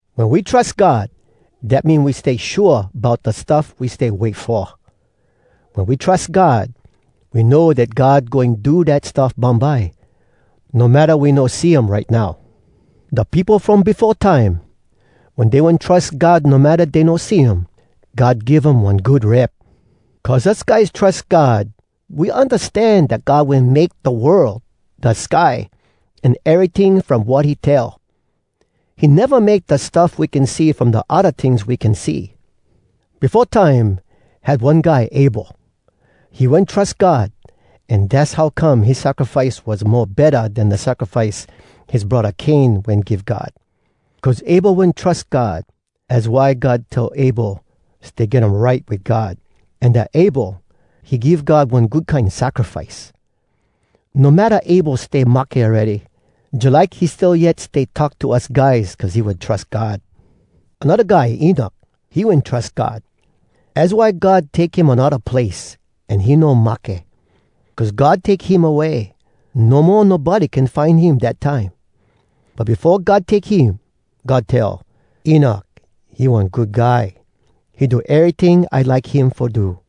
Wen we trus God, dat mean we stay shua bout da stuff we stay wait fo. Wen we trus God, we know dat God goin do dat stuff bumbye, no matta we no see um right now. Da peopo from befo time, wen dey wen trus God no matta dey no see um, God give um one good rep. Cuz us guys trus God, we undastan dat God wen make da world, da sky, an eryting from wat he tell. He neva make da stuff we can see from da odda tings we can see. Befo time, had one guy Abel. He wen trus God, an dass how come his sacrifice was mo betta den da sacrifice his braddah Cain wen give God. Cuz Abel wen trus God, az why God tell Abel stay get um right wit God, an dat Abel, he give God one good kine sacrifice. No matta Abel stay mahke awready, jalike he still yet stay talk to us guys cuz he wen trus God. Anodda guy Enok, he wen trus God. Az why God take him anodda place, an he no mahke. Cuz God take him away, no mo nobody can find him dat time. But befo God take him, God tell, “Enok, he one good guy. He do eryting I like him fo do.”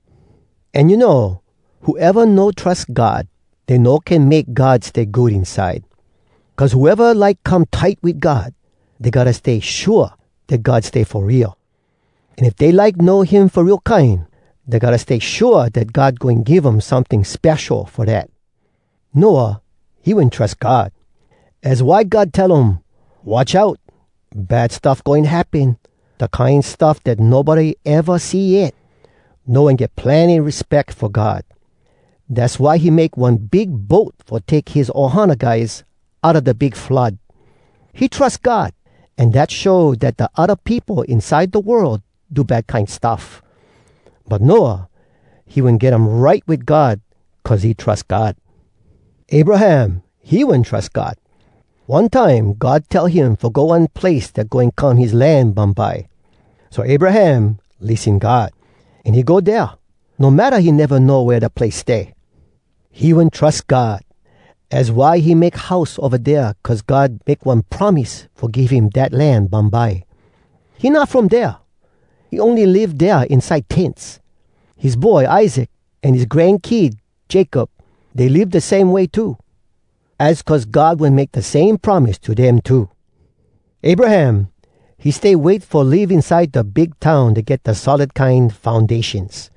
An you know, whoeva no trus God, dey no can make God stay good inside. Cuz whoeva like come tight wit God, dey gotta stay shua dat God stay fo real. An if dey like know him fo real kine, dey gotta stay shua dat God goin give um someting spesho fo dat. Noah, he wen trus God. Az why God tell um, “Watch out! Bad stuff goin happen, da kine stuff dat nobody eva see yet!” Noah wen get plenny respeck fo God. Dass why he make one big boat fo take his ohana guys outa da big flood. He trus God, an dat show dat da odda peopo inside da world do bad kine stuff. But Noah, he wen get um right wit God cuz he trus God. Abraham, he wen trus God. One time God tell him fo go one place dat goin come his land bumbye. So Abraham lissen God, an he go dea, no matta he neva know wea da place stay. He wen trus God. Az why he make house ova dea cuz God make one promise fo give him dat land bumbye. He not from dea. He ony live dea inside tents. His boy Isaac an his grankid Jacob, dey live da same way too. Az cuz God wen make da same promise to dem too. Abraham, he stay wait fo live inside da big town dat get da solid kine foundations.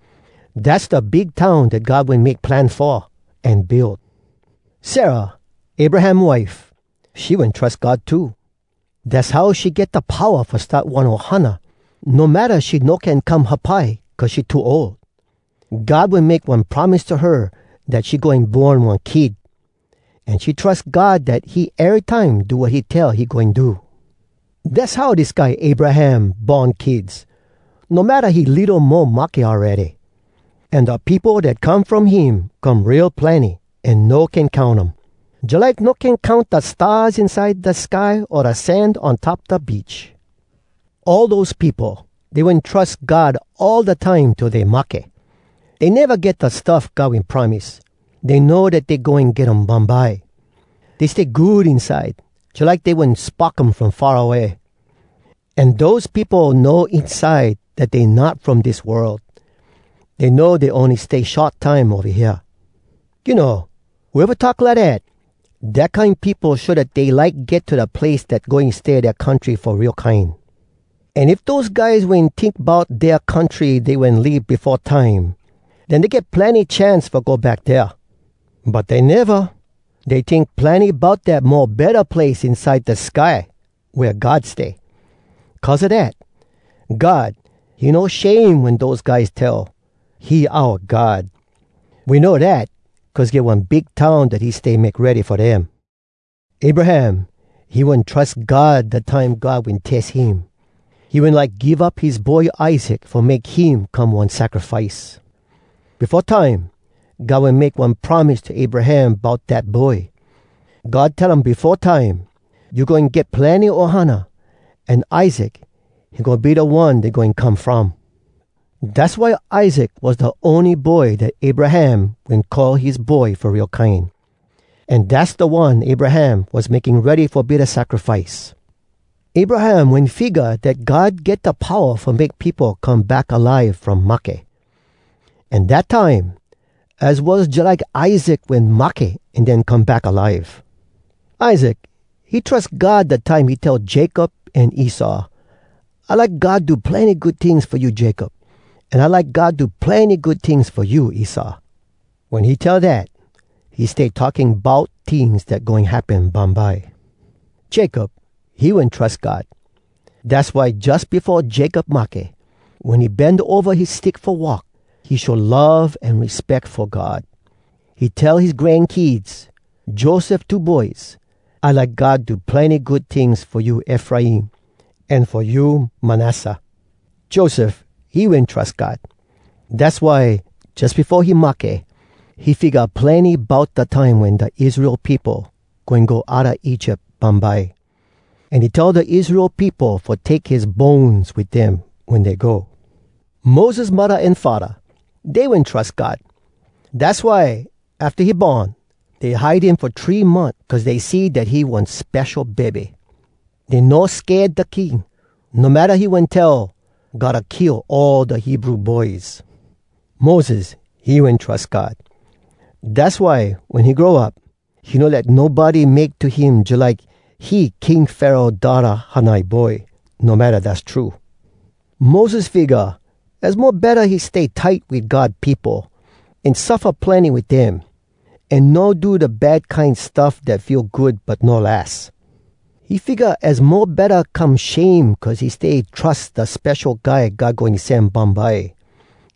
Dass da big town dat God wen make plan fo, an build. Sarah, Abraham wife, she wen trus God too. Dass how she get da powa fo start one ohana, no matta she no can come hapai cuz she too ol. God wen make one promise to her dat she goin born one kid, an she trus God dat he erytime do wat he tell he goin do. Dass how dis guy Abraham born kids no matta he litto mo mahke awready. An da peopo dat come from him come real plenny an no can count um, jalike no can count da stars inside da sky o da sand on top da beach. All dose peopo, dey wen trus God all da time till dey mahke. Dey neva get da stuff God wen promise, dey know dat dey goin get um bumbye. Dey stay good inside, jalike dey wen spock um from far away. An dose peopo know inside dat dey not from dis world. Dey know dey ony stay short time ova hea. You know, whoeva talk lidat, dat kine peopo show dat dey like get to da place dat goin stay dea country fo real kine. An if dose guys wen tink bout dea country dey wen leave befo time, den dey get plenny chance fo go back dea. But dey neva. Dey tink plenny bout dat mo betta place inside da sky wea God stay. Cuz a dat, God, he no shame wen dose guys tell, “He oua God.” We know dat cuz get one big town dat he stay make ready fo dem. Abraham, he wen trus God da time God wen tes him. He wen like give up his boy Isaac fo make him come one sacrifice. Befo time, God wen make one promise to Abraham bout dat boy. God tell um befo time, “You goin get plenny ohana, an Isaac, he goin be da one dey goin come from.” Dass why Isaac was da ony boy dat Abraham wen call his boy fo real kine. An dass da one Abraham was making ready fo be da sacrifice. Abraham wen figga dat God get da powa fo make peopo come back alive from mahke. An dat time, az was jalike Isaac wen mahke an den come back alive. Isaac, he trus God da time he tell Jacob an Esau, “I like God do plenny good tings fo you Jacob, an I like God do plenny good tings fo you Esau.” Wen he tell dat, he stay talking bout tings dat goin happen bumbye. Jacob, he wen trus God. Dass why jus befo Jacob mahke, wen he bend ova his stick fo walk, he show love an respeck fo God. He tell his grankids, Joseph two boys, “I like God do plenny good tings fo you Efraim, an fo you Manasseh.” Joseph, he wen trus God. Dass why, jus befo he mahke, he figga plenny bout da time wen da Israel peopo goin go outa Egypt bumbye. An he tell da Israel peopo fo take his bones wit dem wen dey go. Moses muddah an faddah, dey wen trus God. Dass why, afta he born, dey hide him fo three month cuz dey see dat he one spesho bebe. Dey no sked da king, no matta he wen tell, “Gotta kill all da Hebrew boys!” Moses, he wen trus God. Dass why, wen he grow up, he no let nobody make to him jalike he King Pharaoh daughtah hanai boy no matta dass true. Moses figga az mo betta he stay tight wit God peopo, an suffa plenny wit dem, an no do da bad kine stuff dat feel good but no las. He figga az mo betta come shame cuz he stay trus da Spesho Guy God Goin Sen bumbye,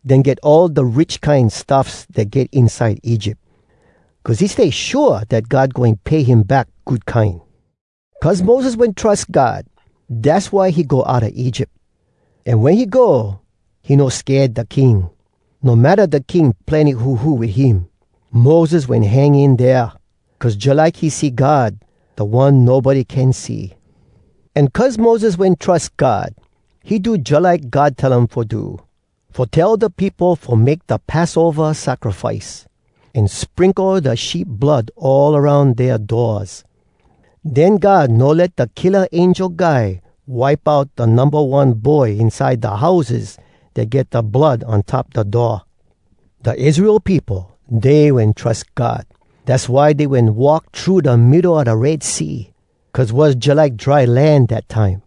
den get all da rich kine stuffs dat get inside Egypt. Cuz he stay shua dat God goin pay him back good kine. Cuz Moses wen trus God, dass why he go outa Egypt. An wen he go, he no sked da king, no matta da king plenny huhu wit him. Moses wen hang in dea, cuz jalike he see God, da One nobody can see. An cuz Moses wen trus God, he do jalike God tell um fo do, fo tell da peopo fo make da Passova sacrifice, an sprinkle da sheep blood all aroun dea doors. Den God no let da killa angel guy wipe out da numba one boy inside da houses dat get da blood on top da door. Da Israel peopo, dey wen trus God. Dass why dey wen walk thru da middo a da Red Sea, cuz was jalike dry land dat time.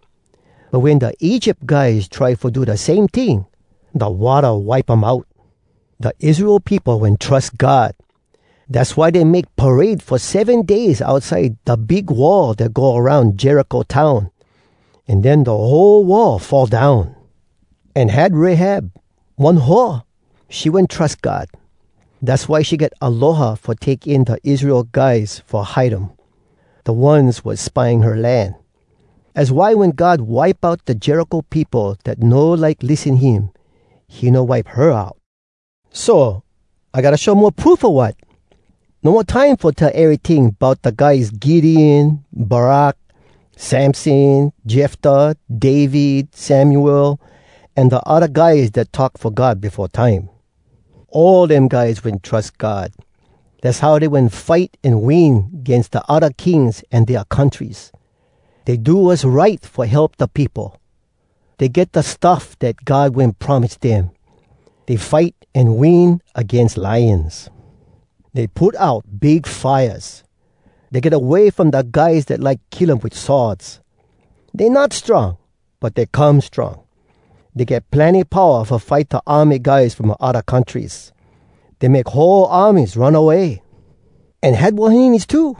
But wen da Egypt guys try fo do da same ting, da watta wipe um out. Da Israel peopo wen trus God. Dass why dey make parade fo seven days outside da big wall dat go aroun Jericho town. An den da whole wall fall down. An had Rahab, one hoa. She wen trus God. Dass why she get aloha fo take in da Israel guys fo hide um, da ones was spying her land. Az why wen God wipe out da Jericho peopo dat no like lissen him, he no wipe her out. So, I gotta show mo proof, o wat? No mo time fo tell eryting bout da guys Gideon, Barak, Samson, Jeftah, David, Samuel, an da odda guys dat talk fo God befo time. All dem guys wen trus God. Dass how dey wen fight an win agains da odda kings an dea countries. Dey do wass right fo help da peopo. Dey get da stuff dat God wen promise dem. Dey fight an win agains lions. Dey put out big fires. Dey get away from da guys dat like kill um wit swords. Dey not strong, but dey come strong. Dey get plenny powa fo fight da army guys from odda countries. Dey make whole armies run away. An had wahines too.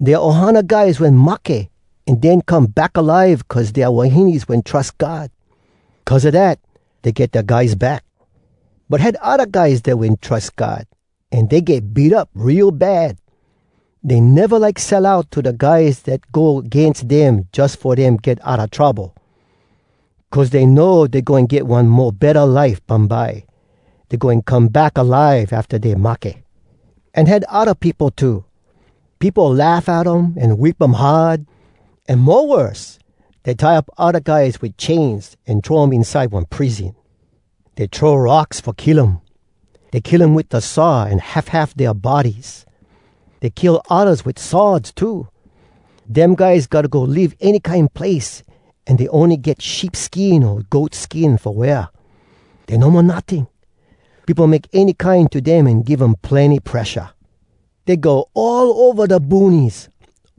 Dea ohana guys wen mahke, an den come back alive cuz dea wahines wen trus God. Cuz a dat, dey get dea guys back. But had odda guys dat wen trus God, an dey get beat up real bad. Dey neva like sell out to da guys dat go agains dem jus fo dem get outa trouble. Cuz dey know dey goin get one mo betta life bumbye—dey goin come back alive afta dey mahke. An had odda peopo too. Peopo laugh at um an whip um hard. An mo worse, dey tie up odda guys wit chains an throw um inside one prison. Dey throw rocks fo kill um. Dey kill um wit da saw an half half dea bodies. Dey kill oddas wit swords too. Dem guys gotta go live any kine place an dey ony get sheep skin o goat skin fo wear. Dey no mo notting. Peopo make any kine to dem an give um plenny presha. Dey go all ova da boonies,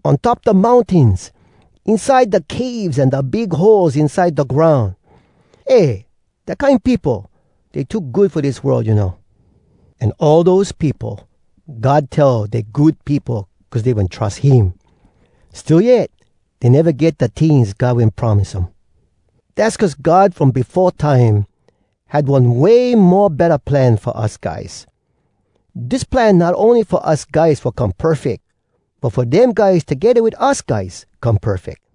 on top da mountains, inside da caves an da big holes inside da groun. Eh! Dat kine peopo, dey too good fo dis world, you know! An all dose peopo, God tell dey good peopo cuz dey wen trus him. Still yet, dey neva get da tings God wen promise um. Dass cuz God from befo time had one way mo betta plan fo us guys. Dis plan not ony fo us guys fo come perfeck, but fo dem guys togedda wit us guys come perfeck.